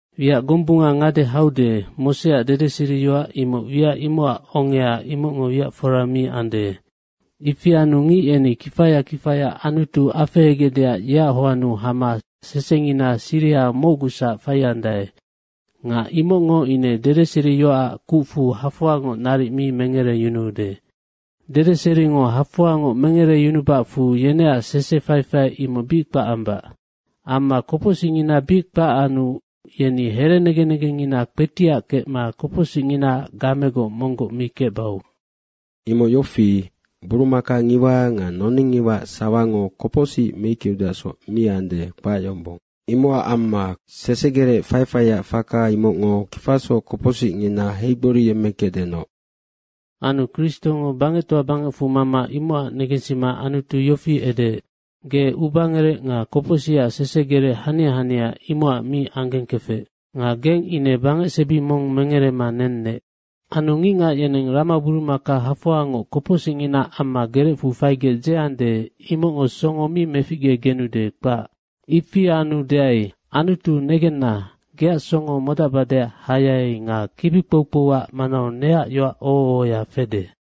Wiac gombunga ngade haude, Moseac dedeseriyoac imoc wiac imocac ongea, imocngo wiac fora mi ande. Ifi anu ngic yeni kifaya kifaya Anutu afehegecdeac yeac hoannu hama sesengina siriha mocgusac faiandae nga imocngo ine dedeseriyoacac kucfu hafoangoc naric mi mengereyunuude. Dedeseringo hafoangoc mengereyunubacfu yeneac sese faifai imoc bic kpac ambac. Amma kopocsicngina bic kpac anu yeni herenegen negengngina kpetiac kecma kopocsicnginaac gamegoc monggoc mi kecbau. Imoc yofi, burumaka ngiwa nga noning ngiwaac sawango kopocsic meickeudeacsoc mi ande, kpac yombong. Imocac amma sesegerec faifaiac faka imocngo kifasoc kopocsicngina heigboriyemmekecdenoc. Anu Kristongo bangectoa bangecfu mama imocac negensima Anutu yofi edeec, “Ge ubangerec nga kopocsicac sesegerec hania hania, imocac mi anggengkefec. Nga geng ine bangecsebi mong mengerema nennec. Anu Ngicngac yeneng ramaburumaka hafoangoc kopocsicnginaac amma gerecfu faigec dzeande, imocngo songo mi meficgegenude, kpac. Ifi anu deai, ‘Anutu, negenna, geac songo modacbadeac hayai nga kibi kpoukpouac manau neac yoac oho ohoya fede.’”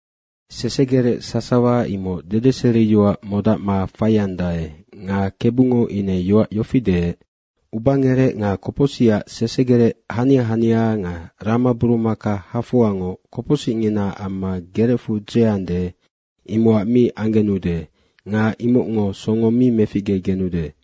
Sesegerec sasawa imoc dedeseriyoac modacma faiandae nga Kebungo ine yoac yofi deec, “Ubangerec nga kopocsicac sesegerec hania hania nga ramaburumaka hafoangoc kopocsicngina amma gerecfu dzeande, imocac mi anggenude nga imocngo songo mi meficgegenude.”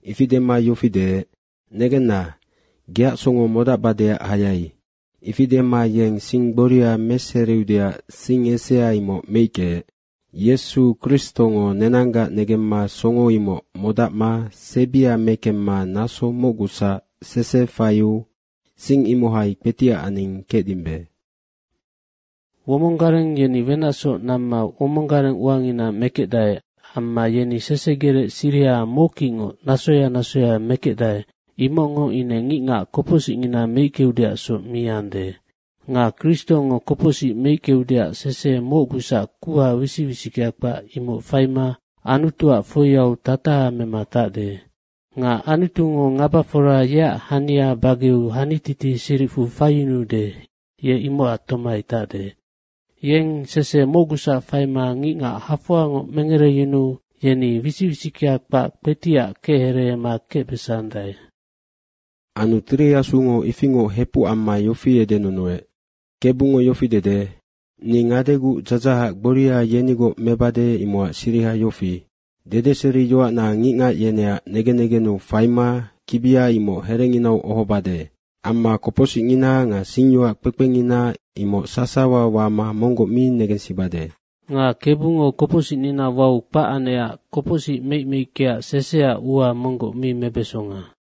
Ifi dema yofi deec, “Negenna, geac songo modacbadeac hayai.” Ifi dema yeng sing gboria meseriudeac sing esea imoc meickeec. Yesu Kristongo nenanggac negemma songo imoc modacma sebia mekemma naso mocgusac sese faiu sing imohai kpetiac aning kecdimbe. Womong gareng yeni wenacsoc namma womong gareng uangina mekecdae amma yeni sesegerec siriha mockicngoc nasoya nasoya mekecdae, imocngo ine ngicngac kopocsicngina meickeudeacsoc mi ande. Nga Kristongo kopocsic meickeudeac sese mocgusac kuha wisic wisickea kpac, imoc faima Anutuac foiau tataha mema tacde. Nga Anutungo ngabafora yeac hania bageu hanititi siricfu faiyunuude, ye imocac tomai tacde. Yeng sese mocgusac faima ngicngac hafoangoc mengereyunuu yeni wisic wisickea kpac kpetiac kechereema kecbesandae. Anu Tiri Asungo ifingoc hepuc amma yofi edenunuec, “Kebungo yofi dede, ‘Ni ngadeguc dzadzahac gboria yenigoc mebade, imocac siriha yofi, dedeseriyoacna ngicngac yeneac negen negennu faima kibia imoc herenginau ohobade. Amma kopocsicngina nga singyoac kpekpengina imoc sasawa wama monggoc mi negensibade.’” Nga Kebungo kopocsicnina wau kpac anecac kopocsic meic meickeac seseac ua monggoc mi mebesonga.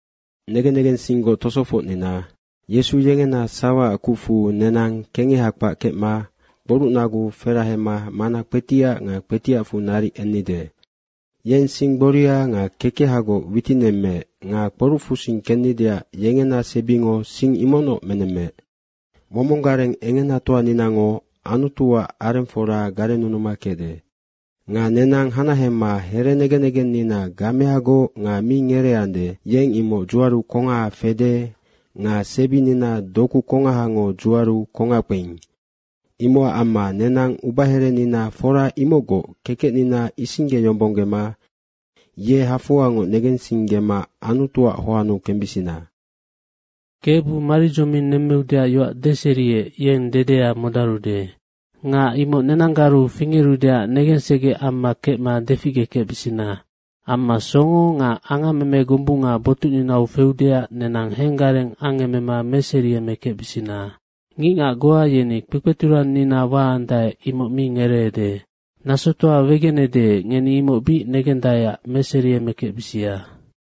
Negen negensinggoc tosofocnina, Yesu yengena sawaac kucfu nenang kengeha kpac kecma kporucnagu ferahema mana kpetiac nga kpetiacfu naric ennide. Yeng sing gboria nga kekehagoc witinemmeec nga kporucfusing kennideac yengena sebingo sing imocnoc menemmeec. Womong gareng engenatoaninango Anutuac arengfora garennunuma kecde. Nga nenang hanahema herenegen negennina gameagoc nga mi ngereeande, yeng imoc dzuaru kongaha fede nga sebinina doku kongahango dzuaru kongac kpeing. Imocac amma nenang ubaherenina fora imocgoc kekecnina isinggeyombonggema ye hafoangoc negensinggema Anutuac hoannu kembisina. Kebu maridzoming nemmeudeac yoac deseriec, yeng dedea modarude. Nga imoc nenanggaru fingerudeac negensegec amma kecma deficgekecbisina. Amma songo nga angammeme gombunga botucninau feudeac nenang henggareng angemema meseriemekecbisina. Ngicngac goa yeni kpekpeturannina waandae, imoc mi ngereede. Nasotoa wegenede, ngeni imoc bic negendaeac meseriemekecbisia.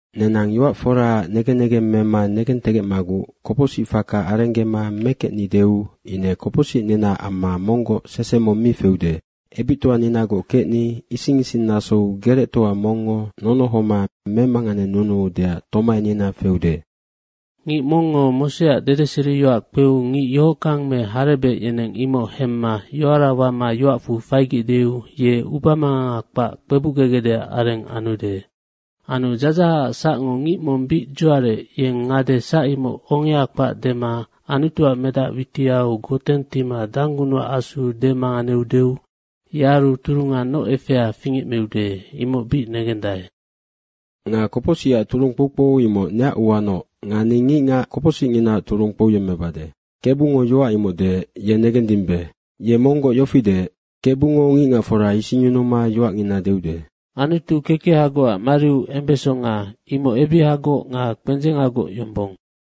Nenang yoac foraac negen negeng mema negentegecmaguc kopocsic faka arenggema mekecnideu ine kopocsicninaac amma monggoc sese mong mi feude. Ebictoaninagoc kecni ising ising nasou gerectoa mongngo nonohoma memanganenunuudeac tomainina feude. Ngic mongngo Moseac dedeseriyoac kpeu ngic yohockang me harebec yeneng imoc hemma yoara wama yoacfu faigecdeu, ye ubamanganga kpac kpebucgegecdeac areng anude. Anu dzadzahacac sacngo ngic mong bic dzuarec, yeng ngade sac imoc ongea kpac dema Anutuac Medac witiau goteng tima Danggunucac Asu demanganeudeu, yearu turunga noc efea fingecmiude, imoc bic negendae. Nga “Kopocsicac turung kpoukpou imoc neac uanoc nga ni ngicngac kopocsicnginaac turung kpouyemmebade.” Kebungo yoac imoc deec, ye negendimbe. Ye monggoc yofi deec, “KEBUNGO ngicngacfora isingyunuma yoacngina deude.” Anutu kekehagocac mariu embesonga, imoc ebihagoc nga kpendzengagoc yombong.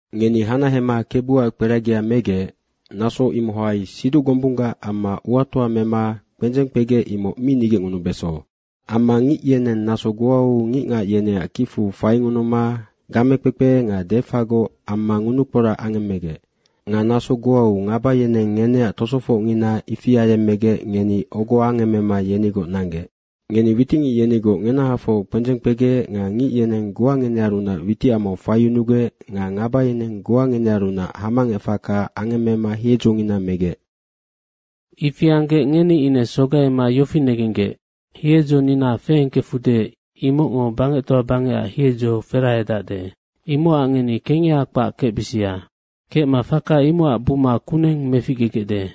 Ngeni hanahema Kebuac kperagia megec, naso imohai siduc gombunggac amma uatoa mema kpendzeng kpegec, imoc mi nigecngunubeso. Amma ngic yeneng naso goau ngicngac yeneac kicfu faingunuma gamekpekpe nga defagoc amma ngunukporac angemmegec. Nga naso goau ngaba yeneng ngeneac tosofocngina ifi ayemmegec ngeni ogo angemmema yenigoc nanggec. Ngeni witicngic yenigoc ngenahafoc kpendzeng kpegec nga ngic yeneng goa ngenearunac witicamau faiyunugec nga ngaba yeneng goa ngenearunac hamangec faka angemmema hiedzongina megec. Ifi anggec ngeni ine sogaima yofi negenggec, hiedzonina feengkefude imocngo bangectoa bangecac hiedzo ferahedacde. Imocac ngeni kengeha kpac kecbisia. Kecma faka imocac buma kuneng meficgegecde.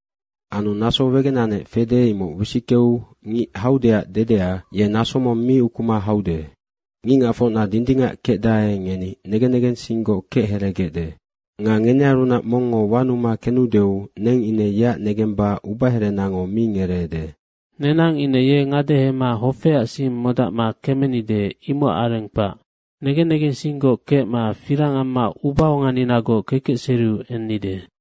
Anu naso wegenanec fede, imoc wisickeu, “Ngic haudeac dedea, ye naso mong mi ukuma haude. Ngicngacfocna dindingac kecdae, ngeni negen negensinggoc kechereegecde. Nga ngenearunac mongngo wanuma kenudeu neng ine yeac negemba ubaherenango mi ngereede.” Nenang ine ye ngadehema hofeac sing modacma kemenide, imocac areng kpac. Negen negensinggoc kecma firang amma ubaonganinagoc kekecseriu ennide.